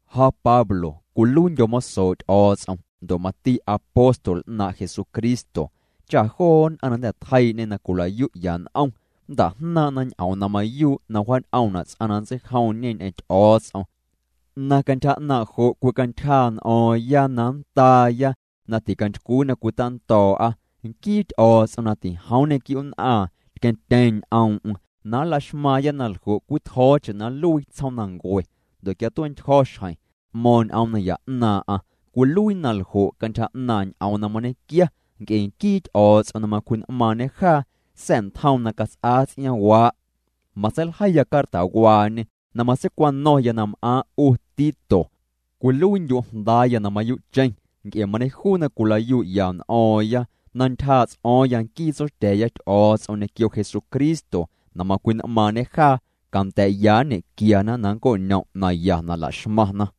Ja Pablo cwiluiindyo̱ mosoo' Ty'o̱o̱ts'om, ndo' mati apóstol 'naaⁿ' Jesucristo cha joo nn'aⁿ na jnda̱ tjeii'ñê na cwila'yu'ya n'om nnta'jnaaⁿ'na ñ'oom na mayuu' na wjaañ'oomna' ts'aⁿ na nntseijomñe ñ'eⁿ Ty'o̱o̱ts'om, na cantyja 'naaⁿ' jo' cwicantyjaa' n'o̱o̱ⁿya na nndaaya na ticantycwii na cwitando̱o̱'a. Nquii Ty'o̱o̱ts'om na tijoom nñequiu'nn'aaⁿ tqueⁿtyeeⁿ ñ'oom'm na nlaxmaaⁿya na ljo' cwitjo̱o̱cheⁿ na nluii tsjoomnancue. Ndo' quia tue'ntyjo̱ xjeⁿ, t'mo̱o̱ⁿ ñ'oom naya 'naaⁿ'aⁿ, cwiluii naljo' cantyja 'naaⁿ' ñ'oom na mañequia nc'e nquii Ty'o̱o̱ts'om na macwji'n'maaⁿñê jaa sa̱'ntjoom na cats'aa ts'iaaⁿwaa'. Matseiljeiya cartawaañe na matseicwano̱ⁿya na m'aaⁿ' 'u Tito, cwiluiindyu' jndaaya na mayuu'cheⁿ nc'e mañejuu na cwila'yu'ya n'o̱o̱ⁿya, na ntyjaa' ts'o̱o̱ⁿya nquii Tsotya̱a̱ya Ty'o̱o̱ts'om ñequio Jesucristo na macwji'n'maaⁿñê jaa, canda̱a̱'ya nñequiana na nnco'ñom' naya na la'xmaⁿna.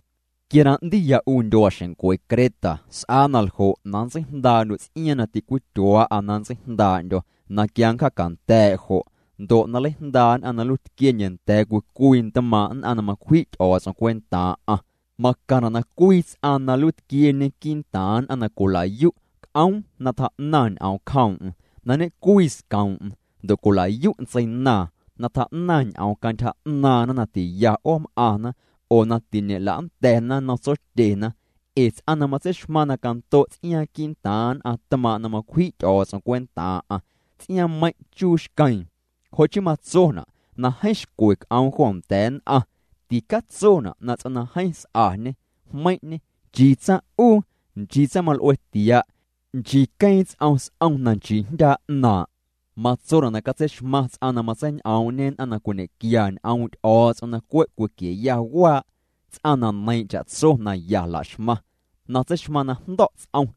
Quia na 'ndiya 'u ndyuaaxencwe Creta, s'aa naljo' na nntseijndaa'ndyu' ts'iaaⁿ na ticwityuaa'a na nntseijndaa'ndyo̱ na quia nncjacanda̱a̱' jo', ndo' na nleijndaa' nn'aⁿ na nluiitquiendye nda̱a̱ nn'aⁿ cwii cwii tmaaⁿ' nn'aⁿ na macwji' Ty'o̱o̱ts'om cwentaaⁿ'aⁿ. Macaⁿna' na cwii ts'aⁿ na nluiitquieñe quii'ntaaⁿ nn'aⁿ na cwila'yu' c'oom na tjaa'naⁿ ñ'oom cjoom'm, na ñe'cwii scoom'm, ndo' cwila'yu' ntseinaaⁿ na tjaa'naⁿ ñ'oom cantyja 'naaⁿna na ti'ya 'oom'aⁿna oo na tiñe'la'nda̱na nnom tsotyena. Ee ts'aⁿ na matseixmaⁿ na cando' ts'iaaⁿ quii'ntaaⁿ nn'aⁿ tmaaⁿ' na macwji' Ty'o̱o̱ts'om cwentaaⁿ'aⁿ, ts'iaaⁿmeiⁿ' chuu xqueeⁿ. Jo' chii matsona' na jeeⁿ xcwe c'oom jo nda̱a̱ nn'aⁿ. Ticatsona' na ts'aⁿ na jeeⁿ s'añe, jmeiⁿ'ñe, nchii tsaⁿ'uu, nchii tsaⁿmal'ue tia', nchii queeⁿ ts'om s'om na nchii jndyaa' 'naaⁿ'. Matsona' na catseixmaⁿ ts'aⁿ na matseiñ'oom'ñe nn'aⁿ na cwiñequia ñ'oom' Ty'o̱o̱ts'om na cwe' cwiquieya waa', ts'aⁿ na neiiⁿ' cha'tso na ya laxmaⁿ, na tseixmaⁿ na jndo̱' ts'om,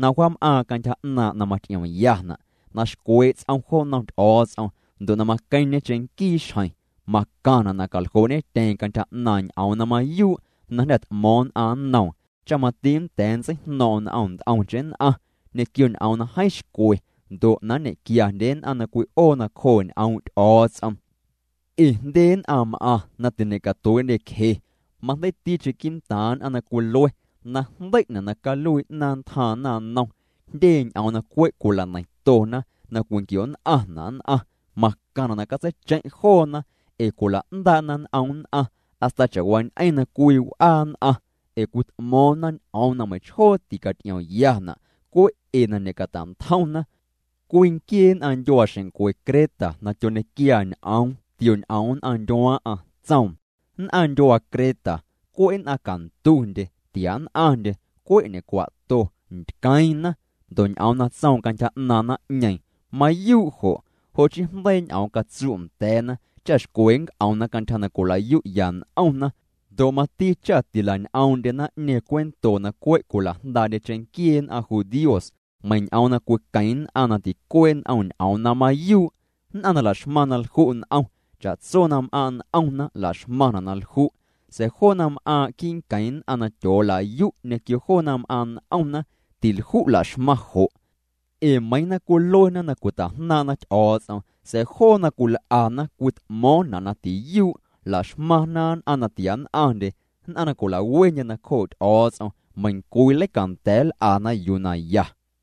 na wjaam'aaⁿ cantyja 'naaⁿ' na maty'iomyana', na xcwee' ts'om jo nnom Ty'o̱o̱ts'om ndo' na maqueⁿñe cheⁿnquii xjeⁿ. Macaⁿna na caljoo'ñetyeeⁿ cantyja 'naaⁿ' ñ'oom na mayuu' na jnda̱ t'mo̱o̱ⁿ nn'aⁿ nnoom, cha mati nnda̱a̱ nntseijno̱o̱ⁿ'o̱ⁿ n'om nt'omcheⁿ nn'aⁿ ñequio ñ'oom na jeeⁿ xcwe ndo' na nñequiandye nn'aⁿ na cwi'oo nacjoo' ñ'oom' Ty'o̱o̱ts'om. Ee jndye nn'aⁿ m'aⁿ na tiñe'catuee'ndyecje, majndeiiticheⁿ quii'ntaaⁿ nn'aⁿ na cwilue najndei'na' na caluii 'naaⁿ ntjaaⁿ naⁿnom, jndye ñ'oom na cwe' cwila'neiⁿtona' na cwinquio'nn'aⁿna' nn'aⁿ. Macaⁿna' na catseicheⁿ' joona ee cwila'ndaa'na n'om nn'aⁿ hasta cha'waañ'eⁿ na cwii w'aa nn'aⁿ. Ee cwit'mo̱o̱ⁿna ñ'oom na meiⁿchjoo ticaty'iomyana' cwe' ee na ñe'cata'ntjomna. Cwii nquiee nn'aⁿ ndyuaa xeⁿncwe Creta na tyoñequiaa ñ'oom tioñ'oom nn'aⁿ ndyuaaⁿ'aⁿ, tsoom: “Nn'aⁿ ndyuaa Creta, cwe' nn'aⁿ cantundye, tia nn'aⁿndye, cwe' ñecwa'to, ntqueeⁿna.” Ndo' ñ'oom na tsoom cantyja 'naaⁿ naⁿ'ñeeⁿ, mayuu' jo'. Jo' chii jndeii' ñ'oom catsu' nda̱a̱na, cha xcwe nnc'omna cantyja na cwila'yu'ya n'omna. Ndo' mati cha tila'ñ'oom'ndye naⁿ'ñeeⁿ cuento na cwe' cwila'jndaa'ndye cheⁿnquiee nn'aⁿ judíos, meiⁿ ñ'oom na cwiqueⁿ nn'aⁿ na ticuee' n'om ñ'oom na mayuu'. Nn'aⁿ na laxmaⁿ na lju' n'om, cha'tso na m'aaⁿ' n'omna laxmaⁿna' na lju'. Sa̱a̱ joo na m'aaⁿ' quii' nqueⁿ nn'aⁿ na tyoolayu' ñequio joo na m'aaⁿ' n'omna, tilju' laxmaⁿ jo'. Ee meiiⁿ na cwiluena na cwita'jnaaⁿ'na Ty'o̱o̱ts'om, sa̱a̱ joo na cwil'ana cwit'mo̱o̱ⁿna' na tiyuu'. Laxmaⁿna nn'aⁿ na tiann'aⁿndye, nn'aⁿ na cwilawendye nacjoo' Ty'o̱o̱ts'om, meiⁿcwii leicanda̱a̱ nl'ana yuu na ya.